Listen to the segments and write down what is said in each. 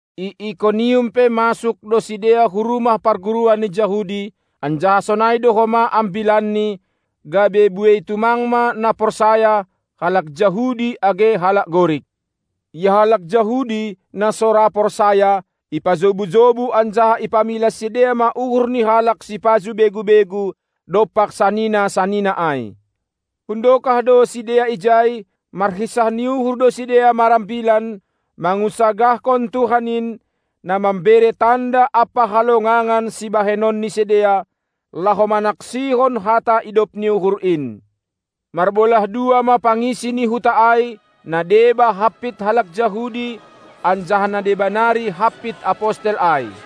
I Ikonium pe masuk do sidea hu rumah parguruan ni Jahudi, anjaha sonai do homa ambilanni, gabe buei tumang ma na porsaya, halak Jahudi age halak Gorik. Ia halak Jahudi, na so ra porsaya, ipajobu-jobu anjaha ipamilas sidea ma uhur ni halak sipajuh begu-begu dompak sanina-sanina ai. Hundokah do sidea ijai, marhinsah ni uhur do sidea marambilan, mangunsagahkon Tuhan in, na mambere tanda ampa halongangan sibahenon ni sidea, laho manaksihon hata idop ni uhur in. Marbolah dua ma pangisi ni huta ai, na deba hampit halak Jahudi, anjaha na deba nari hampit apostel ai.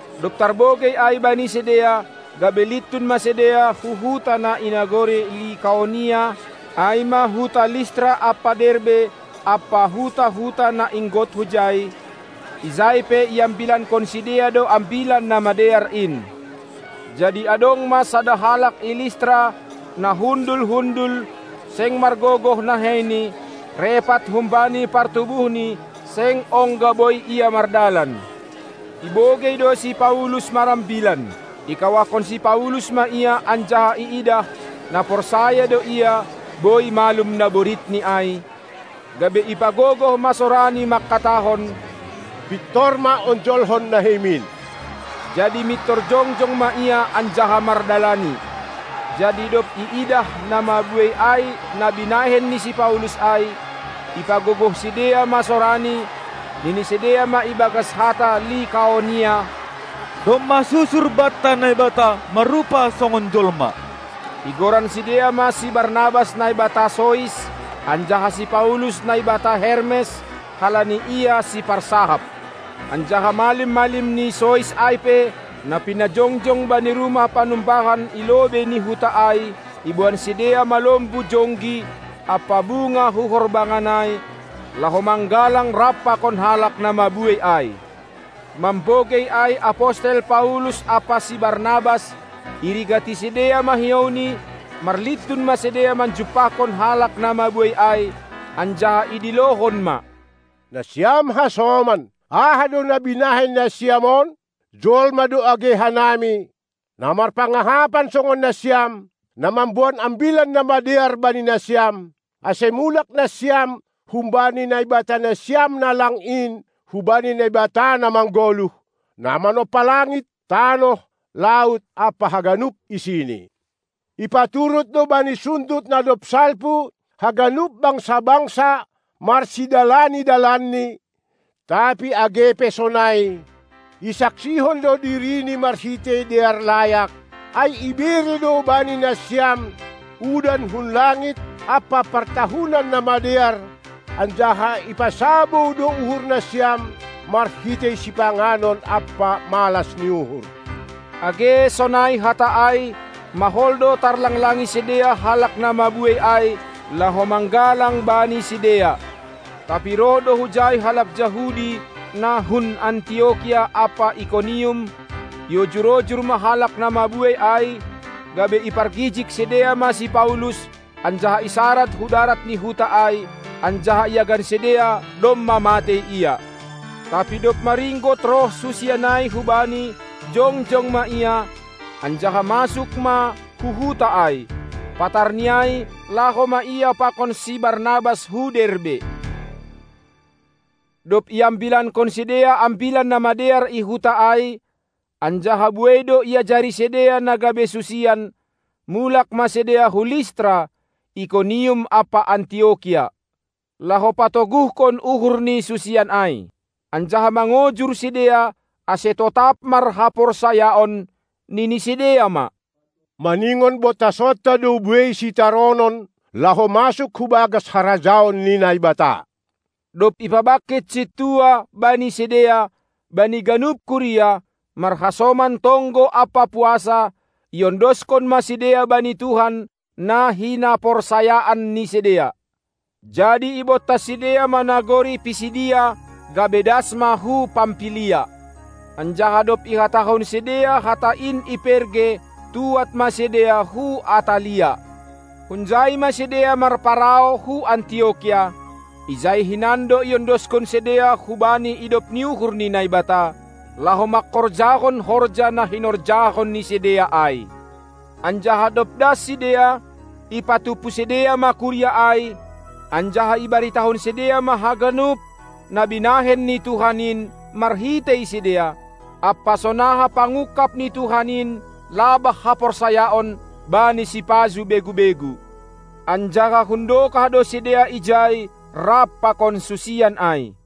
Dob tarbogei ai bani sidea, gabe lintun ma sidea hu huta na i nagori Likaonia, ai ma huta Listra ampa Derbe ampa huta-huta na inggot hujai; ijai pe iambilankon sidea do Ambilan Namadear in. Jadi adong ma sada halak i Listra, na hundul-hundul, seng margogoh naheini, repat humbani partubuhni, seng ongga boi ia mardalan. Ibogei do si Paulus marambilan. Ikawahkon si Paulus ma ia anjaha iidah, na porsaya do ia, boi malum naboritni ai, gabe ipagogoh ma sorani mangkatahon: Pintor ma onjolhon naheimin! Jadi mintor jongjong ma ia anjaha mardalani. Jadi dob iidah na mabuei ai na binahen ni si Paulus ai, ipagogoh sidea ma sorani, nini sidea ma ibagas hata Likaonia: Domma susur banta naibata marrupa songon jolma! Igoran sidea ma si Barnabas naibata Sois, anjaha si Paulus naibata Hermes, halani ia siparsahap. Anjaha malim-malim ni Sois ai pe, na pinajongjong bani rumah panumbahan i lobei ni huta ai, iboan sidea ma lombu jonggi ampa bunga hu horbangan ai, laho manggalang rap pakon halak na mabuei ai. Mambogei ai apostel Paulus ampa si Barnabas, irigati sidea ma hiouni, marlintun ma sidea manjumpahkon halak na mabuei ai, anjaha idilohon ma: Nasiam hasoman, aha do na binahen nasiam on? Jolma do age hanami, na marpangahapan songon nasiam, na mamboan Ambilan Namadear bani nasiam, ase mulak nasiam humbani naibatanasiam na lang in hubani Naibata na manggoluh, na manompa langit, tanoh, laut ampa haganup isini. Ipaturut do bani sundut na dob salpu haganup bangsa-bangsa marsidalani dalanni, tapi age pe sonai, isaksihon do dirini marhitei dear layak, ai ibere do bani nasiam udan hun langit ampa partahunan na madear, anjaha ipasabou do uhurnasiam marhitei sipanganon ampa malas ni uhur. Age sonai hata ai, mahol do tarlanglangi sidea halak na mabuei ai laho manggalang bani sidea. Tapi roh do hujai halak Jahudi na hun Antiokia ampa Ikonium; iojur-ojur ma halak na mabuei ai, gabe ipargijig sidea ma si Paulus anjaha isarad hu darat ni huta ai, anjaha iagan sidea, domma matei ia. Tapi dob maringgot roh susian ai hubani, jongjong ma ia, anjaha masuk ma hu huta ai. Patarni ai laho ma ia pakon si Barnabas hu Derbe. Dob iambilankon sidea Ambilan Namadear i huta ai, anjaha buei do iajari sidea na gabe susian, mulak ma sidea hu Listra, Ikonium ampa Antiokia, laho patoguhkon uhur ni susian ai, anjaha mangojur sidea ase totap marhaporsayaon, nini sidea ma: Maningon bontasonta do buei sitaronon laho masuk hu bagas harajaon ni Naibata. Dob ipabangkit sintua bani sidea bani ganup kuria, marhasoman tonggo ampa puasa, iondoskon ma sidea bani Tuhan, na hinaporsayaan ni sidea. Jadi ibontas sidea ma nagori Pisidia, gabe das ma hu Pampilia. Anjaha dob ihatahon sidea hata in i Perge, tuad ma sidea hu Atalia. Hunjai ma sidea marparau hu Antiokia; ijai do hinan iondoskon sidea hubani idop ni uhur ni Naibata, laho mangkorjahon horja na hinorjahon ni sidea ai. Anjaha dob das sidea, ipatumpu sidea ma kuria ai, anjaha ibaritahon sidea ma haganup na binahen ni Tuhan in marhitei sidea, ampa sonaha pangungkap ni Tuhan in labah haporsayaon bani sipajuh begu-begu. Anjaha hundokah do sidea ijai rap pakon susian ai.